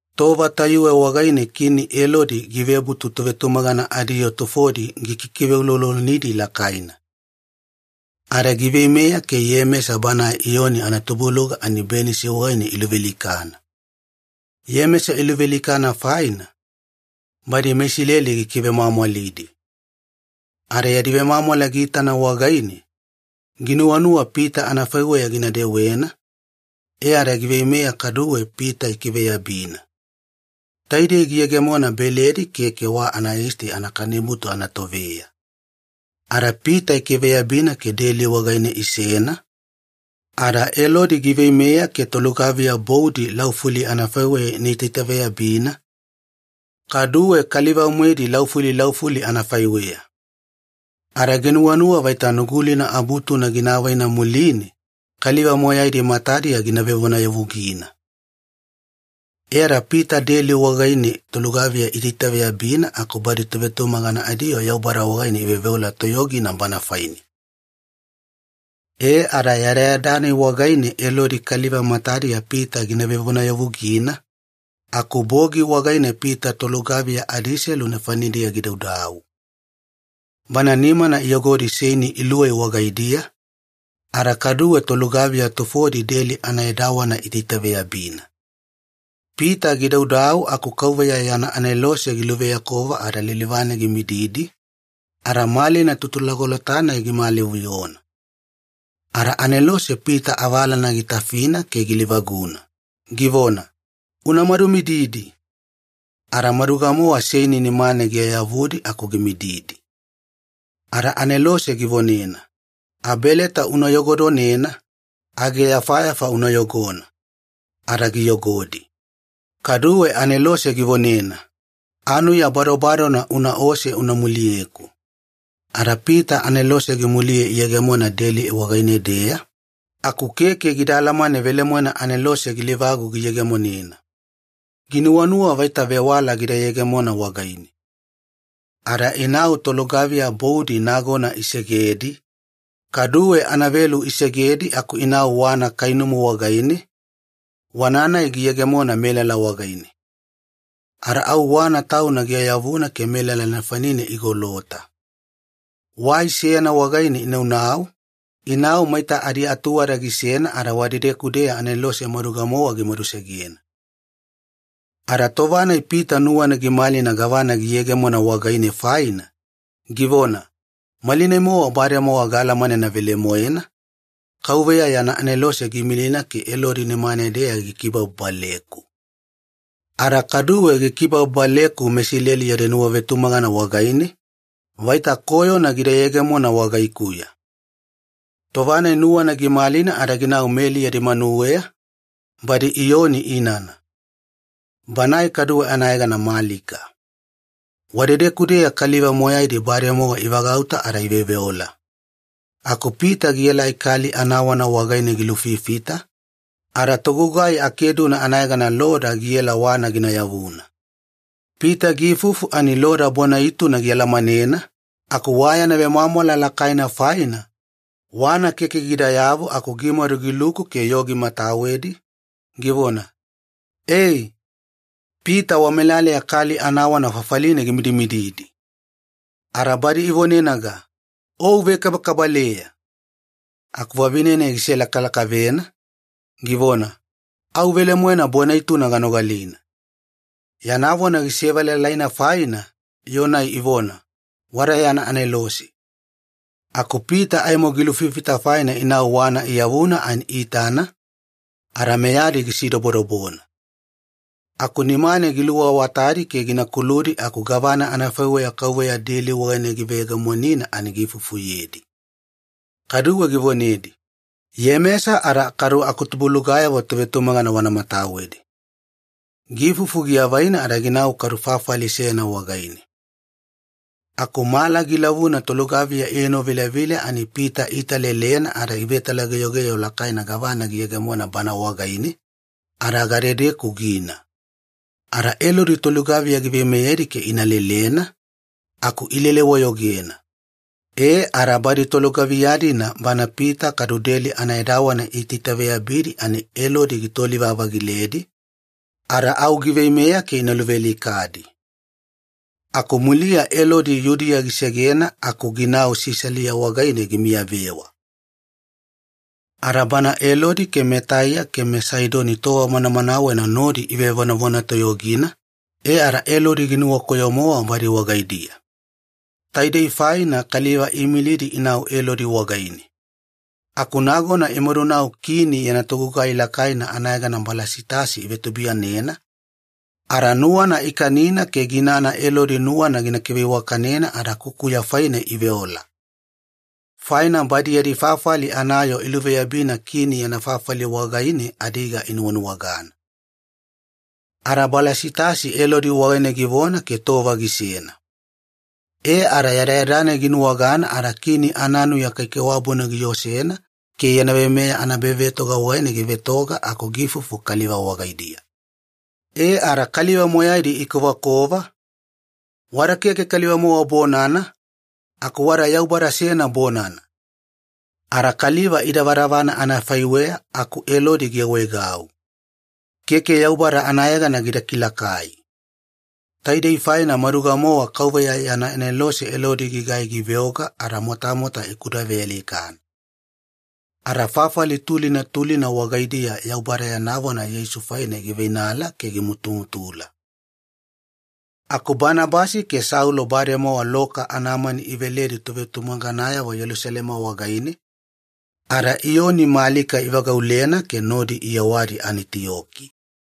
Tova tayuwe wagaine Kini Elodi givebutu tovetumagana adiyoo tufodi gikikiveuloulolonidi lakaina. Ada giveimeya ke Iyemesa banae Iyoni anatubuluga ani benisi wagaine iluvealikana. Iyemesa giluvealikana faina, badi meIsileli gikivemwamwalidi. Ada yadi vemwamwala giitana wagaine, ginuwanuwa Pita anafaiweya gina dewena, e ada giveimeya kaduwe Pita ikiveyabina. Taidei giyegemona Beledi Keke Wa Anayisti Anakanibutu anatoveya. Ada Pita ikiveyabina ke deli wagaine isena, ada Elodi giveimeya ke tolugaviya boudi laufuli anafaiweya ina itaitaveyabina, kaduwe kaliva-moedi laufuli laufuli anafaiweya. Ada ginuwanuwa vaita Nugulina abutuna gina avaina muline, kaliva moyaidi matadiya gina vevonayavugina. E ada Pita deli wagaine tolugaviya iitaitaveyabina aku badi tovetumagana adiyoo Yaubada wagaine iveoveola toyogina bana faine. E ada yadayada-nai wagaine Elodi kaliva matadiya Pita gina vevonayavugina, aku bogi wagaine Pita tolugaviya adiselu nefanidiya gidaudau. Bana nimana iyogodi seini iluwei wagaidiya, ada kaduwe tolugaviya tufodi deli anaedawana iitaitaveyabina. Pita gidaudau aku KAUVEYA yana anelose giluveyakova ada lilivane gimididi, ada malina tutulagolota-nai gimalivuyona. Ada anelose Pita avalana gitafina ke gilivaguna, givona, “Una madumididi.” Ada maduga-mowa seini nimane giayavudi aku gimididi. Ada anelose givonena, “Abeleta una yogodonena, ageyafayafa una yogona.” Ada giyogodi. Kaduwe anelose givonena, “Anuya badobadona unaose una muliyeku.” Ada Pita anelose gimuliye iyegemona deli wagaine-deya, aku keke gida alamane velemoena anelose gilivagu giyegemonena. Ginuwanuwa vaita vewala gida yegemona wagaine. Ada inau tolugaviya boudi nagona isegedi, kaduwe anavelu isegedi aku inau wana kainumu wagaine, wana-nai giyegemona melala wagaine. Ada au wana tauna giayavuna ke melala nefanine igolota. Wai seyana wagaine inaunau, inau maita adiatuwada gisena ada wadedeku-deya anelose maduga-mowa gimadusegena. Ada tova-nai Pita nuwana gimalina gavana giyegemona wagaine faina, givona, “Malinai-mowa bademowa gaalamanena velemoena, Kauveya yana anelose giimilina ke Elodi nimane-deya gikibababaleku. Ada kaduwe gikibababaleku meIsileli yadi nuwavetumagana wagaine, vaita koyona gida yegemona wagaikuya.” Tova-nai nuwana gimalina ada ginau Meli yadi manuweya, badi Iyoni inana. Banae kaduwe anayegana Malika. Wadedeku-deya kaliva moyaidi bademowa ivagauta ada iveoveola. Aku Pita gielai kali anawana wagaine gilufifita, ada togugai akeduna anayegana Loda giela wana gina yavuna. Pita giifufu ani Loda bona-ituna gialamanena, aku wa yana vemwamwala lakaina faina, wana keke gidayavu aku gimadu giluku ke yoo gimatawedi, givona, “Ee! Pita wamelaleya kali anawana fafaline gimidimididi!” Ada badi ivonenaga, “O uvekabakabaleya!” Aku vavine-nai giselakalakavena, givona, “Au velemoena bona-ituna ganogalina.” Yana vona gisevelalaina faina, yoo-nai ivona, “Wada yana anelose.” Aku Pita aimo gilulufifita faina inau wana iyavuna ani iitana, ada meyadi gisidobodobona. Aku nimane giluawatadi ke gina kuludi aku gavana anafaiweya Kauveya deli wagaine giveyegemonina ani giifufuyedi. Kaduwe givonedi, “Iyemesa ada kadu tubuiyadeyavo tovetumagana wana matawedi.” Giifufu giavaina ada ginau kadu fafali seyana wagaine. Aku mala gilavuna tolugaviya ienovilavila ani Pita iitalelena ada ivetalageyogeyo lakaina gavana giyegemona bana wagaine, ada gadedeku gina. Ada Elodi tolugaviya giveimeyedi ke ina lelena, aku ilele-wayogena. E ada badi tolugaviya-dina bana Pita kadu deli anaedawana iitaitaveyabidi ani Elodi gitoli-vavagiledi, ada au giveimeya ke ina luvealikadi. Aku muliya Elodi Yudiya gisegena aku ginau Sisalia wagaine gimiyavewa. Ada bana Elodi meTaiya ke meSaidoni tova manamanawena nodi ivevonavona toyogina, e ada Elodi ginuwakoyo-mowa badi wagaidiya. Taidei faina kaliva iimilidi inau Elodi wagaine. Aku nagona imadunau kini yana togugai lakaina anayegana Balasitasi ivetubuiyanena, ada nuwana ikanina ke ginana Elodi nuwana gina kiveiwakanena ada kukuya faine iveola. Faina badi yadi fafali anayoo iluveyabina Kini yana fafali wagaine adiga inuwanuwagana. Ada Balasitasi Elodi wagaine givona ke tova gisena. E ada yadayada-nai ginuwagana ada kini ananuya kaikaiwabuna giosena ke yana veimeya anaebavetoga wagaine givetoga aku giifufu kaliva wagaidiya. E ada kaliva moyaidi ikovakova, “Wada keke kaliva-mowa bonana, aku wada yaubada seyana bonana!” Ada kaliva idavadavana anafaiweya aku Elodi giawaegau. Keke Yaubada anayegana gida kilakai. Taidei faina maduga-mowa KAUVEYA yana anelose Elodi gigai giveoga ada motamota ikudavealikana. Ada fafali tulina tulina wagaidiya Yaubada yana vona Yeisu faine giveiveinala ke gimutumutula. Aku Banabasi ke Saulo bademowa loka anamani iveledi tovetumaganayavo Yelusalema wagaine, ada Iyoni Malika ivagaulena ke nodi iyewadi Anitiyoki.